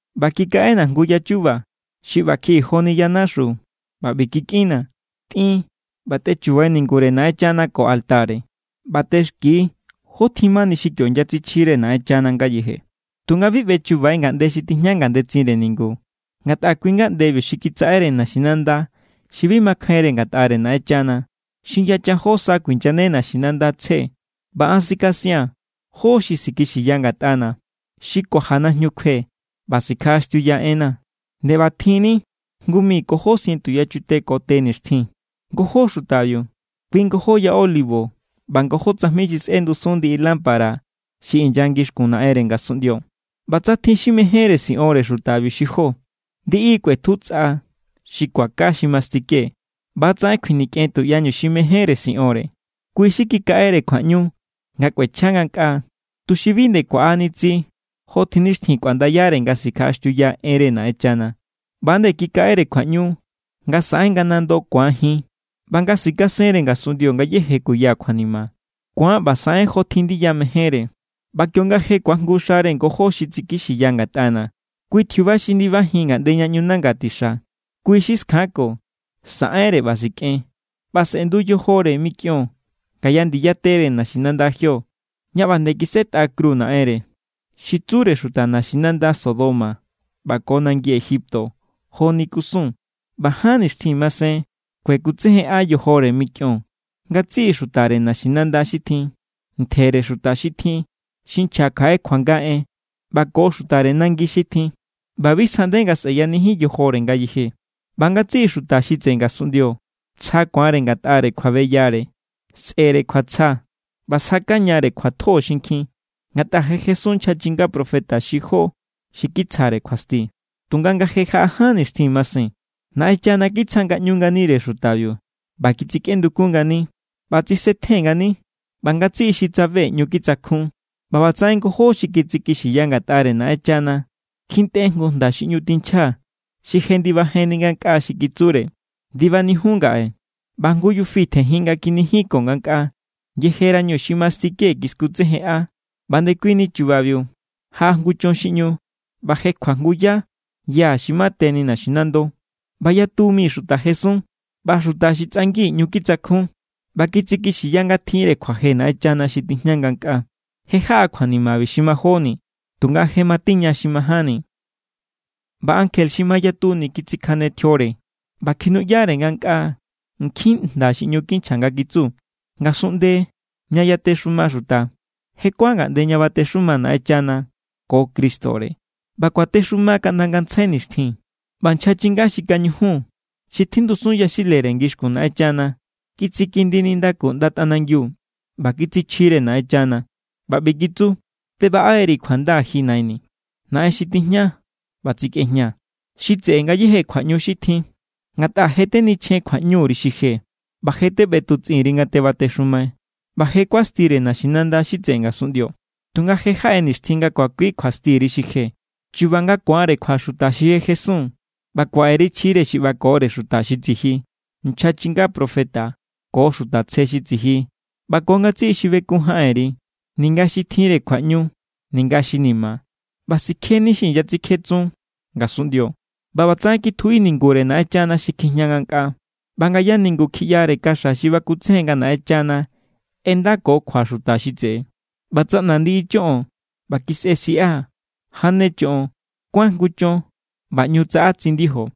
ꞌBa kikaꞌena̱ jngu ya chu̱ba̱ xi ꞌba kjiꞌi joni yanaxu, ꞌba ꞌbi kikꞌinnaa̱: “Tꞌin ꞌba tꞌechubai ningure Naꞌenchana ko altare. ꞌBa tꞌexki jó tjin mani xi kio inyatsichjire Naꞌenchana ngayeje. Tunga bi ꞌbechubai ngaꞌnde xi tijña ngandetsinre ningu, ngatꞌa kui= ngaꞌndebiu xi kitsaꞌere naxinanda xi bi makjainre ngatꞌare Naꞌenchana. Xi yachan jó sa kuinyane naxinanda tsje. ꞌBa an sikasia̱n jó xi sikixiya ngatꞌana̱. Xi kuaja najñu kjue ꞌba sikjaꞌaxtiuya enna̱ nde ꞌbatjinni jngu mi ko jó sientu yachute ko te nixtjin.” Ngojó xutabiu, kui ngojó ya olivo ꞌba ngojó tsajmi xi sꞌendusun ndiꞌi lámpara xi inya ngixkun Naꞌenre ngasunꞌndio. ꞌBa tsa tjin xi mejénre siꞌonre xutabiu xi jó, ndiꞌi= kꞌuetju tsꞌa xi kuaka xi mastike. ꞌBa=tsaꞌen kjuinikꞌen tuꞌyañu xi mejénre siꞌonre. Kui= xi kikaꞌere kjuaꞌñu nga kꞌuechja ngankꞌaa, tuxi bi nde kuaꞌani tsi jotjin nixtjin kuaꞌndayare nga sikjaꞌaxtiuya enre Naꞌenchana. ꞌBa=nde kikaꞌere kjuaꞌñu nga saꞌen nga nando ku̱an jin ꞌba nga sikasenre ngasunꞌndio ngayéje kuya kjuanima. Ku̱an ꞌba saꞌen jotjin ndiya mejénre. ꞌBa kionga je ku̱ajngu xare ngojó xi tsikixiya ngatꞌana̱, kui tjiuba xi ndibanijin ngaꞌnde ña ꞌñu nanga tixa, kui= xi skjanko, saꞌenre ꞌba sikꞌen. ꞌBa sꞌe̱ndu yojore mikꞌion ngaya ndiya tere naxinanda jio, ña ꞌba nde kisꞌetꞌa kru Naꞌenre. Xi tsure xuta naxinanda “Sodoma” ꞌba ko nangi “Egipto” joni kusun. ꞌBa ján nixtjin masen kuekutsejenꞌa yojore mikꞌion ngatsiꞌi xutare naxinanda xi tjin, ntjere xuta xi tjin, xi nchja kjaꞌe kjuanga en, ꞌba ko xutare nangi xi tjin. ꞌBa bi sjaꞌnde nga sꞌeyanijin yojore ngayeje. ꞌBa ngatsiꞌi xuta xi tseꞌe ngasunꞌndio tsja ku̱anre ngatꞌare kjuabeyare. Sꞌe̱re kjuatsja ꞌba sjakañare kjuatjo xinkjin, ngatꞌa je jesun nchja chinga profeta xi jó xi kitsjare kjuasti. Tunga nga je jaꞌa ján nixtjin masen, Naꞌenchana kitsja ngaꞌñu nganire xutabiu ꞌba kitsikꞌendukun ngani. ꞌBa tsisetjen ngani, ꞌba ngatsiꞌi xi tsabe ꞌñu kitsakjun. ꞌBa ꞌbatsaꞌen ngojó xi tsikixiya ngatꞌare Naꞌenchana kjintꞌe jngu jnda xi ꞌñu tinchja, xi jendibajenni ngankꞌaa xi kitsure: “¡Ndibanijiun ngaꞌe!” ꞌBa jngu yufi tjenjin nga kinijinko ngankꞌaa yejerañu xi mastike kiskutsejenꞌa. ꞌBa ndekuini chubabiu jaꞌa jngu chon xi ꞌñu, ꞌba jekjua jngu yá ya xi mateni naxinando. ꞌBa yatu mi xuta jesun. ꞌBa xuta xi tsꞌangi ꞌñu kitsakjun ꞌba kitsikixiya nga tjinre kjuaje Naꞌenchana xi tijña ngankꞌaa. Je jaꞌa kjuanima xi majóni, tunga je matiña xi majánni. ꞌBa ankje xi mayatuni kitsikjane tjiore, ꞌba kjinuꞌyare ngankꞌaa nkjin jnda xi ꞌñu kinchja nga kitsu: Ngasunꞌnde ña yatexuma xuta, je kuán ngaꞌnde ña batexuma Naꞌenchana ko Cristore, ꞌba kuatexuma kaꞌnda ngantsjai nixtjin. ꞌBa nchja chinga xi kañujun xi tjindusun yaxilere ngixkun Naꞌenchana kitsikindi nindaku ꞌnda tꞌanangiu ꞌba kitsichjire Naꞌenchana ꞌba ꞌbi kitsu: Tebaꞌe=ri̱ kjuanda, ji Naini̱, Naꞌen xi tijña ꞌba tsikꞌejña, xi tseꞌe ngayéje kjuaꞌñu xi tjin. Ngatꞌa je tenichjen kjuaꞌñuri xi je, ꞌba je teꞌbetutsꞌin_ri nga tebatexumai. ꞌBa je= kuastire naxinanda xi tseꞌe ngasunꞌndio, tunga je= jaꞌe nixtjin nga kuakui kjuastiri xi je, chu̱ba̱ nga ku̱anre kjua xuta xi je jesun, ꞌba kuaꞌeri chjire xi ꞌbakore xuta xi tsiji, nchja chinga profeta ko xuta tsje xi tsiji ꞌba ko ngatsiꞌi xi bekun jaꞌenri, ninga xi tjinre kjuaꞌñu ninga xi ni̱ma̱. ꞌBa sikjeni xi inyatsikjetsun ngasunꞌndio. ꞌBa ꞌbatsaꞌen kitjuꞌi ningure Naꞌenchana xi kjijña ngankꞌaa, ꞌba ngaya ningu kjiꞌyare kaxa xi bakutsejen nga Naꞌenchana ꞌendako kjua xuta xi tseꞌe. ꞌBa tsaꞌna ndiꞌi choꞌon, ꞌba kisꞌe siꞌa, jane choꞌon, kuán jngu chon, ꞌba ꞌñu tsaꞌa tsindijo.